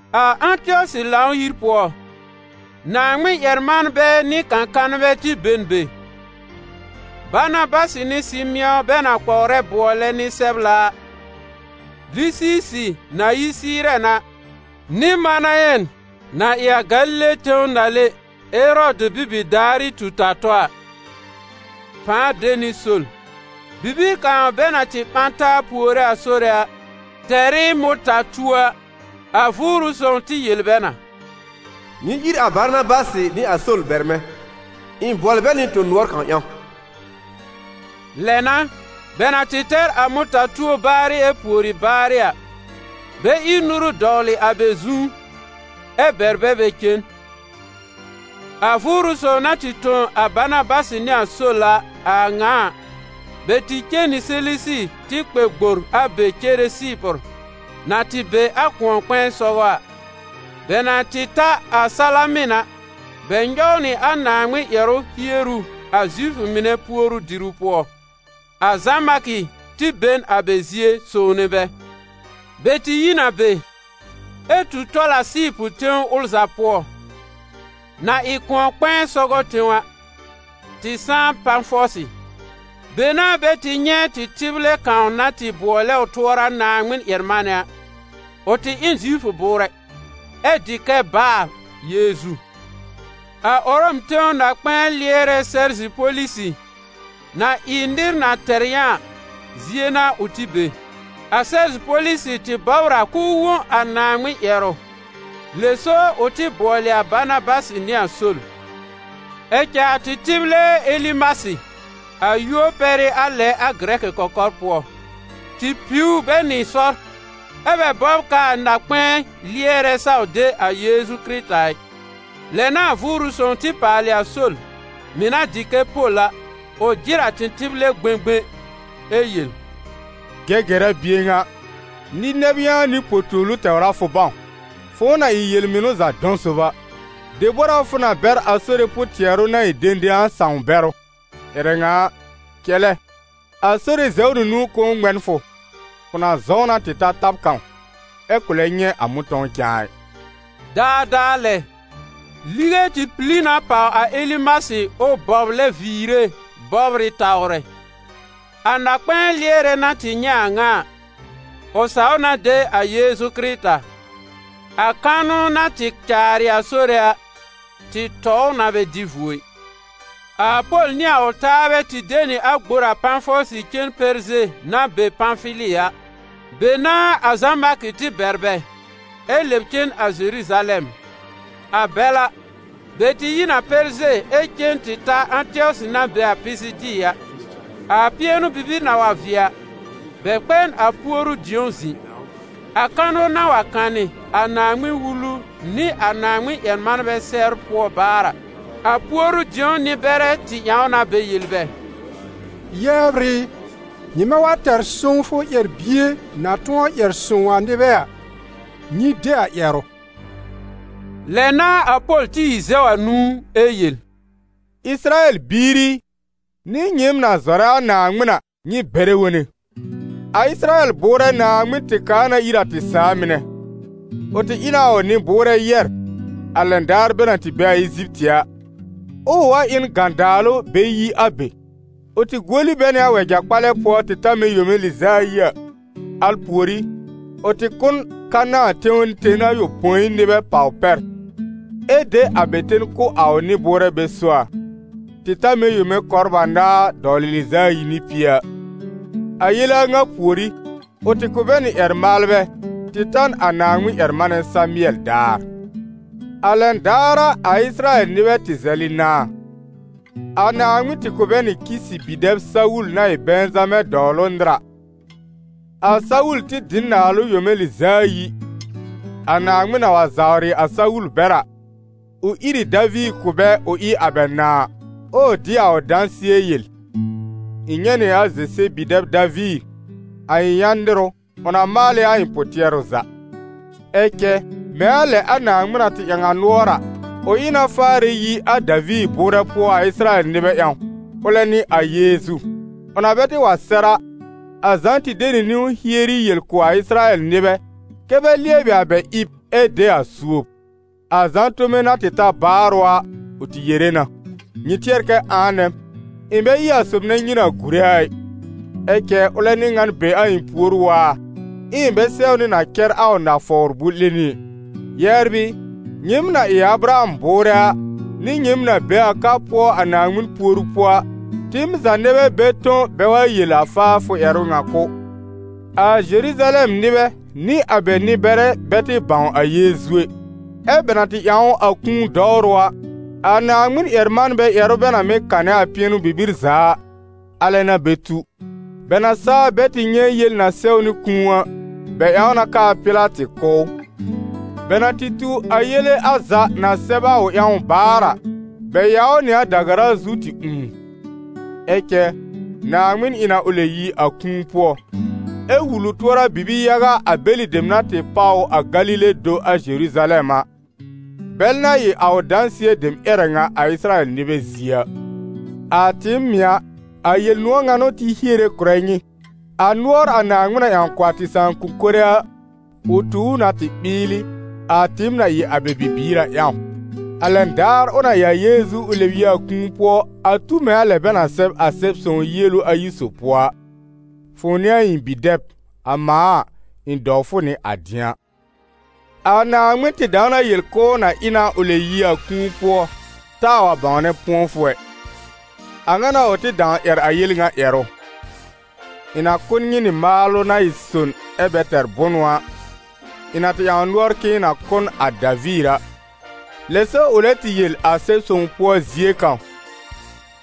A Ãtɩɔsɩ Lãw-yir pʋɔ, Naaŋmɩn-ƴɛr-manbɛ nɩ kã-kanbɛ tɩ be n be: Banabasɩ nɩ Sɩmɩ̃ɔ bɛ na kpɔwrɛ bʋɔlɛ Nɩ-sɛbla a, Lisiisɩ na yi Sɩɩrɛn a, nɩ Manayɛn na ɩ a Galile tẽw nàle Erɔdɩ bibi-daarɩ tu-ta-tɔ a, pãa de nɩ Sol. Bibir kãw bɛ na tɩ ɓã taa puore a Sore, tɛr ɩ mʋ̃ta-tuo a, a Vʋʋrʋ Sõw tɩ yel bɛ na: «Nyɩ ír a Banabasɩ nɩ a Sol bɛr mɛ̃: ɩ̃ bʋɔlɩ bɛ nɩ tõ-nʋɔr kãw ƴãw.» Lɛ n'a, bɛ na tɩ tɛr a mʋ̃ta-tuo baarɩ ɛ pùori baarɩ a, bɛ ír nuru dɔwlɩ a bɛ zu, ɛ bɛr bɛ bɛ cen. A Vʋʋrʋ Sõw na tɩ tõ a Banabasɩ nɩ a Sol a a ŋa a, bɛ tɩ cen nɩ Selesi tɩ kpɛ gbor a be cere Sɩɩpʋr, na tɩ be a kʋ̃ɔ-kpɛ̃ɛ sɔgɔ a. Bɛ na tɩ ta a Salamɩn a, bɛ nyɔw nɩ a Naaŋmɩn ƴɛrʋ hieru a Zifʋ mɩnɛ puoru-diru pʋɔ. A Zã-Markɩ tɩ be n a bɛ zie sõwne bɛ. Bɛ tɩ yi n a be, ɛ tu tɔl a Sɩɩpʋr tẽw ʋl za pʋɔ, na ɩ kʋ̃ɔ-kpɛ̃ɛ sɔgɔ tẽw a, tɩ sãá Pafɔsɩ. Be n'a bɛ tɩ nyɛ̃ tɩtɩblɛ kãw na tɩ bʋɔlɛ ʋ tʋɔra Naaŋmɩn-ƴɛr-manɛ a. Ʋ tɩ ɩ n Zifʋ bʋʋrɛ, ɛ dɩ kɛ Baar Yeezu. A Ʋrɔm tẽw na-kpɛ̃ɛ lɩɛrɛ Sɛrzi-Polisɩ, na ɩ nɩr na tɛr yã a, zie n'a ʋ tɩ be. A Sɛrzi-Polisɩ tɩ bɔbr a k'ʋʋ wõ a Naaŋmɩn ƴɛrʋ, lɛ so ʋ tɩ bʋɔlɩ a Banabasɩ nɩ a Sol. Ɛ cɛ a tɩtɩblɛ Elimasɩ, - a yúor pɛr ɩ a lɛ a gɩrɛkɩ kɔkɔr pʋɔ - tɩ piw bɛ nɩ sɔr, ɛ́ bɛ bɔbr k'aa na-kpɛ̃ɛ lɩɛrɛ saw de a Yeezu Kɩrɩta ɩ. Lɛ n'a a Vʋʋrʋ Sõw tɩ paalɩ a Sol, mɩ̀ na dɩ kɛ Pol a, ʋ jɩr a tɩtɩblɛ gbẽgbẽ ɛ yel: «Gɛgɛra bie ŋa, nɩ-nɛb yã nɩ po-tuolu tɛwr a fʋ bãw, fʋ̃ʋ na ɩ yel-mɩnʋ za dɔ̃ sob a! Debor a fʋ na bɛr a Sore pʋ-tɩɛrʋ na ɩ dẽdẽ a sãw-bɛrʋ? Ƴɛrɛ ŋa a, cɛlɛ, a Sore zɛw nɩ nũu k'ʋʋ ŋmɛ n fʋ: fʋ na zɔ̃w na tɩ ta tab kãw, ɛ kʋ̃ lɛ nyɛ̃ a mʋ̃tɔ̃w cãa ɩ.» Daadaa lɛ, lige tɩ pili na pàw a Elimasɩ ʋ bɔblɛ viire bɔbr ɩ tawrɛ. A na-kpɛ̃ɛ lɩɛrɛ na tɩ nyɛ̃ a a ŋa a, ʋ saw na de a Yeezu Kɩrɩta; a kanʋ na tɩ caarɩ a Sore a, tɩ tɔ ʋ na bɛ dɩ vuo ɩ. A Pol nɩ a ʋ taabɛ tɩ de nɩ a gbor a Pafɔsɩ cen Pɛrze na be Pãfili a. Be n'a a Zã-Markɩ tɩ bɛr bɛ, ɛ lɛb cen a Zeruzalɛm. A bɛl a, bɛ tɩ yi n a Pɛrze ɛ cen tɩ ta Ãtɩɔsɩ na be a Pisidi a. A pɩɛnʋ-bibir na wa vɩɛ a, bɛ kpɛ n a puoru-dĩ̀ó zɩ̃. A kanʋ na wa kanɩ a Naaŋmɩn-Wulu nɩ a Naaŋmɩn-ƴɛr-manbɛ sɛbr pʋɔ baar a, a puoru-dĩo nɩ-bɛrɛ tɩ ƴãw na bɛ yel bɛ: «Yɛbr ɩ, nyɩmɛ wa tɛr sõwfʋ ƴɛr-bie na tʋ̃ɔ ƴɛr sõw a nɩbɛ a, nyɩ de a ƴɛrʋ.» Lɛ n'a a Pol tɩ ìr zɛw a nũu ɛ yel: «Ɩsɩrayɛl biir i, nɩ nyɩɩm na zɔrɛ a Naaŋmɩn a, nyɩ bɛrɛ wone. A Ɩsɩrayɛl bʋʋrɛ Naaŋmɩn tɩ kaa na ir a tɩ sãà mɩnɛ. Ʋ tɩ ɩ na a ʋ nɩ-bʋʋrɛ yɛ̀r, a lɛn daar bɛ na tɩ be a Eziptɩ a, ɛ ʋ wa ɩ n gãdaalʋ bɛ yi a be. Ʋ tɩ guoli bɛ nɩ a wɛja-kpalɛ pʋɔ tɩ ta mɛ̃ yome lɩz'a ayi a. Al pùorí, ʋ tɩ kʋ́ n Kanãa tẽw ten ayopõi nɩbɛ pàw pɛr, ɛ de a bɛ ten kʋ̀ a ʋ nɩ-bʋʋrɛ bɛ so a, tɩ ta mɛ̃ yome kɔbr anaar dɔwlɩ lɩz'a ayi nɩ pie a. A yele a ŋa pùorí, ʋ tɩ kʋ̀ bɛ nɩ ƴɛr-maalbɛ tɩ ta n a Naaŋmɩn-ƴɛr-manɛ Samɩɛl daar. A lɛn daar a, a Ɩsɩrayɛl nɩbɛ tɩ zɛlɩ nãà. A Naaŋmɩn tɩ kʋ̀ bɛ nɩ Kisɩ bi-dɛb Sawul na ɩ Bɛ̃zamɛ dɔwlʋ nɩr a. A Sawul tɩ dɩ n naalʋ yome lɩz'a ayi. A Naaŋmɩn na wa zawrɩ a Sawul bɛr a, ʋ ír ɩ Daviir kʋ̀ bɛ ʋ ɩ a bɛ nãà, ɛ ʋ dɩ a ʋ dãsɩɛ yel: ‹Ɩ̃ nyɛ̃ nɩ a Zese bi-dɛb Daviir, a ɩ̃ yã nɩr ʋ, ʋ na maal ɩ a ɩ̃ pʋ-tɩɛrʋ za.› Ɛ cɛ mɛ̃ a lɛ a Naaŋmɩn na tɩ ƴãw a nʋɔr a, ʋ ɩ na faarɛ yi a Daviir bʋʋrɛ pʋɔ a Ɩsɩrayɛl nɩbɛ ƴãw, ʋlɛ n'ɩ a Yeezu. Ʋ na bɛ tɩ wa sɛr a, a Zã tɩ de nɩ niwn hieri yel kʋ̀ a Ɩsɩrayɛl nɩbɛ kɛ́ bɛ lɩɛbɩ a bɛ ɩb ɛ de a suob. A Zã tome na tɩ ta baarʋ a, ʋ tɩ yere na: ‹Nyɩ tɩɛr kɛ ãa nɛ m? Ɩ̃ bɛ ɩ a sob nɛ nyɩ na gùre a ɩ, ɛ cɛ ʋlɛ n'ɩ ŋan be a ɩ̃ pùor waar, ɛ ɩ̃ bɛ sɛwnɩ na cɛr a ʋ nafawr bʋ̃-'lẽni ɛ.›» «Yɛbr ɩ, nyɩɩm na ɩ a Abraham bʋʋrɛ a, nɩ nyɩɩm na be a ka pʋɔ a Naaŋmɩn puoru pʋɔ a, tɩɩm za nɛ bɛ bɛ tõ bɛ wa yel a faafʋ ƴɛrʋ ŋa kʋ̀. A Zeruzalɛm nɩbɛ nɩ a bɛ nɩ-bɛrɛ bɛ tɩ bãw a Yeezu ɛ, ɛ́ bɛ na tɩ ƴãw ʋ a kũu dɔwrʋ a, a Naaŋmɩn-ƴɛr-manbɛ ƴɛrʋ bɛ na mɩ́ kanɛ a pɩɛnʋ-bibir za a, alɛ n'a bɛ tu. Bɛ na saa bɛ tɩ nyɛ̃ yel na sɛwnɩ kũu a, bɛ ƴãw na k'aa Pɩlatɩ kʋ́ ʋ. Bɛ na tɩ tu a yele a za, na sɛb a ʋ ƴãw a baarɩ a, bɛ yaw ʋ nɩ a da-gara zu tɩ ũù. Ɛ cɛ Naaŋmɩn ɩ na ʋ lɛb yi a kũu pʋɔ, ɛ wul ʋ tʋɔra bibi-yaga a bɛlɩ dem na tɩ páw ʋ a Galile do a Zeruzalɛm a, bɛl na ɩ a ʋ dãsɩɛ dem ƴɛrɛ ŋa a Ɩsɩrayɛl nɩbɛ zie a. A tɩɩm mɩ̀ a, a Yel-nʋ̃ɔ̀ ŋa n'ʋ tɩ hiere kʋ̀rɛ nyɩ: a nʋɔr a Naaŋmɩn na ƴãw kʋ̀ a tɩ sãakʋm mɩnɛ a, ʋ tu ʋ na tɩ ɓɩɩlɩ, a tɩɩm na ɩ a bɛ bibiir a ƴãw, a lɛn daar ʋ na ɩ a Yeezu ʋ lɛb yi a kũu pʋɔ, a tu mɛ̃ a lɛ bɛ na sɛb a Sɛb-sõw yielu ayi sob pʋɔ a: ‹Fʋ̃ʋ n'ɩ a ɩ̃ bi-dɛb, a mãa a, ɩ̃ dɔw fʋ nɩ a dɩ̃a.› A Naaŋmɩn tɩ dãw na yel k'ʋʋ na ɩ na ʋ lɛb yi a kũu pʋɔ taa wa bãwnɛ pʋ̃ɔfʋ ɛ. A ŋa n'a ʋ tɩ dãw ƴɛr a yel ŋa ƴɛrʋ: ‹Ɩ̃ na kʋ̀ nyɩ nɩ maalʋ na ɩ son ɛ́ bɛ tɛr bʋnʋ a, ɩ̃ na tɩ ƴãw nʋɔr k'ɩ̃ɩ na kʋ̀ n a Daviir a.› Lɛ so ʋ lɛ tɩ yel a Sɛb-sõw pʋɔ zie kãw: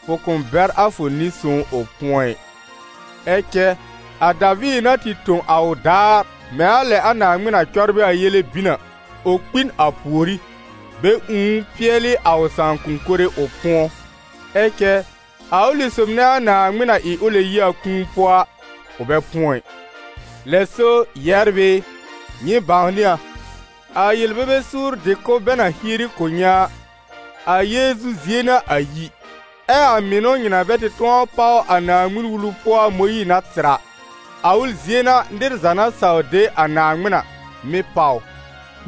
‹Fʋ kʋ̃ bɛr a fʋ Nɩ-sõw ʋ pʋ̃ɔ ɩ.› Ɛ cɛ a Daviir na tɩ tõ a ʋ daar, mɛ̃ a lɛ a Naaŋmɩn na cɔbrɩ a yele bin a, ʋ kpi n a pùorí, bɛ ũù ʋ pɩɛlɩ a ʋ sãakʋm mɩnɛ, ʋ pʋ̃ɔ. Ɛ cɛ a ʋlɩ sob nɛ a Naaŋmɩn na ɩ ʋ lɛb yi a kũu pʋɔ a, ʋ bɛ pʋ̃ɔ ɩ. Lɛ so, yɛbr ɩ, nyɩ bãwnɩ a, a yel-bebe suur dɩ-kʋ̀b bɛ na hieri kʋ̀ nyɩ a, a Yeezu zie n'a a yi, ɛ a mɩnʋ nyɩ na bɛ tɩ tʋ̃ɔ páw a Naaŋmɩn-Wulu pʋɔ a Mõyiir na tɩr a, a ʋl zie n'a nɩr za na saw de a Naaŋmɩn a, mɩ́ páw ʋ.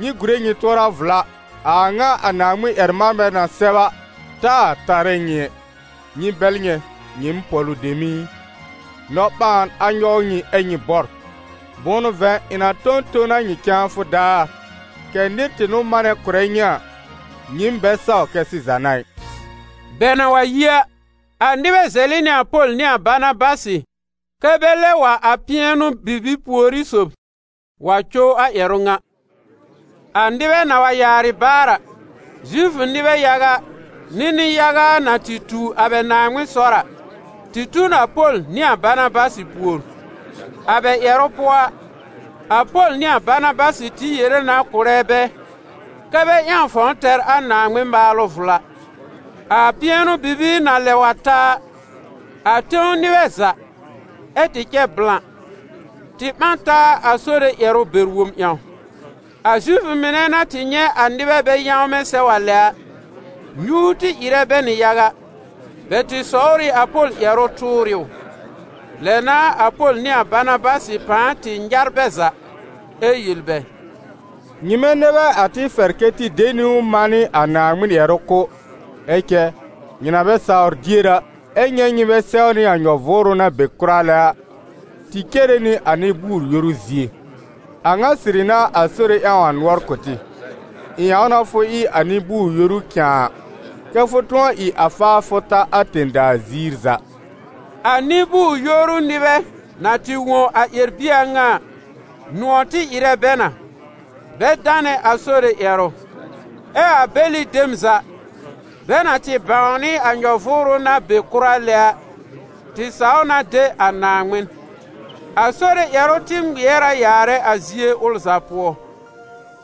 Nyɩ gùre nyɩ tʋɔra vla, a a ŋa a Naaŋmɩn-ƴɛr-manbɛ na sɛb a, taa tarɛ nyɩ ɛ: ‹Nyɩ bɛl nyɛ̃, nyɩɩm pɔ̀lʋ dem ɩ, nɔ-ɓãan a nyɔw nyɩ, ɛ́ nyɩ bɔr! Bʋ̃ʋ n'ʋ vɛ̃, ɩ̃ na tõ n ton a nyɩ cãafʋ daar, kɛ̀ nɩr tɩ n'ʋ manɛ kʋ̀rɛ nyɩ a, nyɩɩm bɛ saw kɛ sɩza n'a ɩ.›» Bɛ na wa yi a, a nɩbɛ zɛlɩ nɩ a Pol nɩ a Banabasɩ kɛ́ bɛ lɛb wa a pɩɛnʋ-bibir pùorí sob wa cow a ƴɛrʋ ŋa. A nɩbɛ na wa yaarɩ baar a, Zifʋ nɩbɛ yaga nɩ nɩ-yaga na tɩ tu a bɛ Naaŋmɩn sɔr a, tɩ tu n a Pol nɩ a Banabasɩ pùor. A bɛ ƴɛrʋ pʋɔ a, a Pol nɩ a Banabasɩ tɩ yere na kʋ̀rɛ bɛ kɛ́ bɛ ƴãw fãw tɛr a Naaŋmɩn maalʋ vla. A pɩɛnʋ-bibir na lɛ wa ta a, a tẽw nɩbɛ za, ɛ tɩ cɛ blã, tɩ ɓã n taa a Sore ƴɛrʋ bɛr-wob ƴãw. A Zifʋ mɩnɛ na tɩ nyɛ̃ a nɩbɛ bɛ yãwmɛ̃ sɛw a lɛ a, nyuur tɩ ɩrɛ bɛ nɩ yaga, bɛ tɩ sɔwr a Pol ƴɛrʋ tʋʋr ɩ ʋ. Lɛ n'a a Pol nɩ a Banabasɩ pãa tɩ nyar bɛ za ɛ yel bɛ: «Nyɩmɛ nɛ bɛ a tɩ fɛr kɛ́ tɩ de niwn manɩ a Naaŋmɩn ƴɛrʋ kʋ̀, ɛ cɛ nyɩ na bɛ sawr dier a, ɛ nyɛ̃ nyɩ bɛ sɛwnɩ a nyɔ-vʋʋrʋ na be kʋra lɛ a, tɩ cere nɩ a nɩ-bʋʋr-yoru zie. A ŋa sɩrɩ n'a a Sore ƴãw a nʋɔr kʋ̀ tɩ: ‹Ɩ̃ ƴãw na fʋ ɩ a nɩ-bʋʋr-yoru cãa, kɛ́ fʋ tʋ̃ɔ ɩ a faafʋ ta a tẽ-daa ziir za.›» A nɩ-bʋʋr-yoru nɩbɛ na tɩ wõ a ƴɛr-bie a ŋa a, nʋ̃ɔ̀ tɩ ɩrɛ bɛ na, bɛ danɛ a Sore ƴɛrʋ; ɛ a bɛlɩ dem za, bɛ na tɩ bãwnɩ a nyɔ-vʋʋrʋ na be kʋra lɛ a, tɩ saw na de a Naaŋmɩn. A Sore ƴɛrʋ tɩ ŋmɩɛr a yaarɛ a zie ʋl za pʋɔ.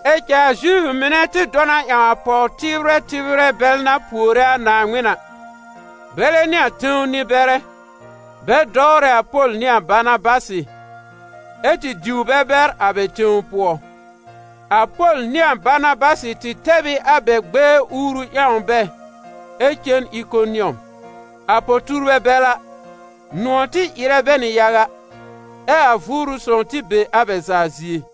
Ɛ cɛ a Zifʋ mɩnɛ tɩ dɔ na ƴãw a pɔw-tɩbrɛ tɩbrɛ bɛl na puore a Naaŋmɩn a, bɛlɛ nɩ a tẽw nɩ-bɛrɛ, bɛ dɔwrɛ a Pol nɩ a Banabasɩ, ɛ tɩ diw bɛ bɛr a bɛ tẽw pʋɔ. A Pol nɩ a Banabasɩ tɩ tɛb ɩ a bɛ gbɛɛ uuru ƴãw bɛ ɛ cen Ɩkonɩɔm. A po-tuurbɛ bɛl a, nʋ̃ɔ̀ tɩ ɩrɛ bɛ nɩ yaga, ɛ a Vʋʋrʋ Sõw tɩ be a bɛ za zie.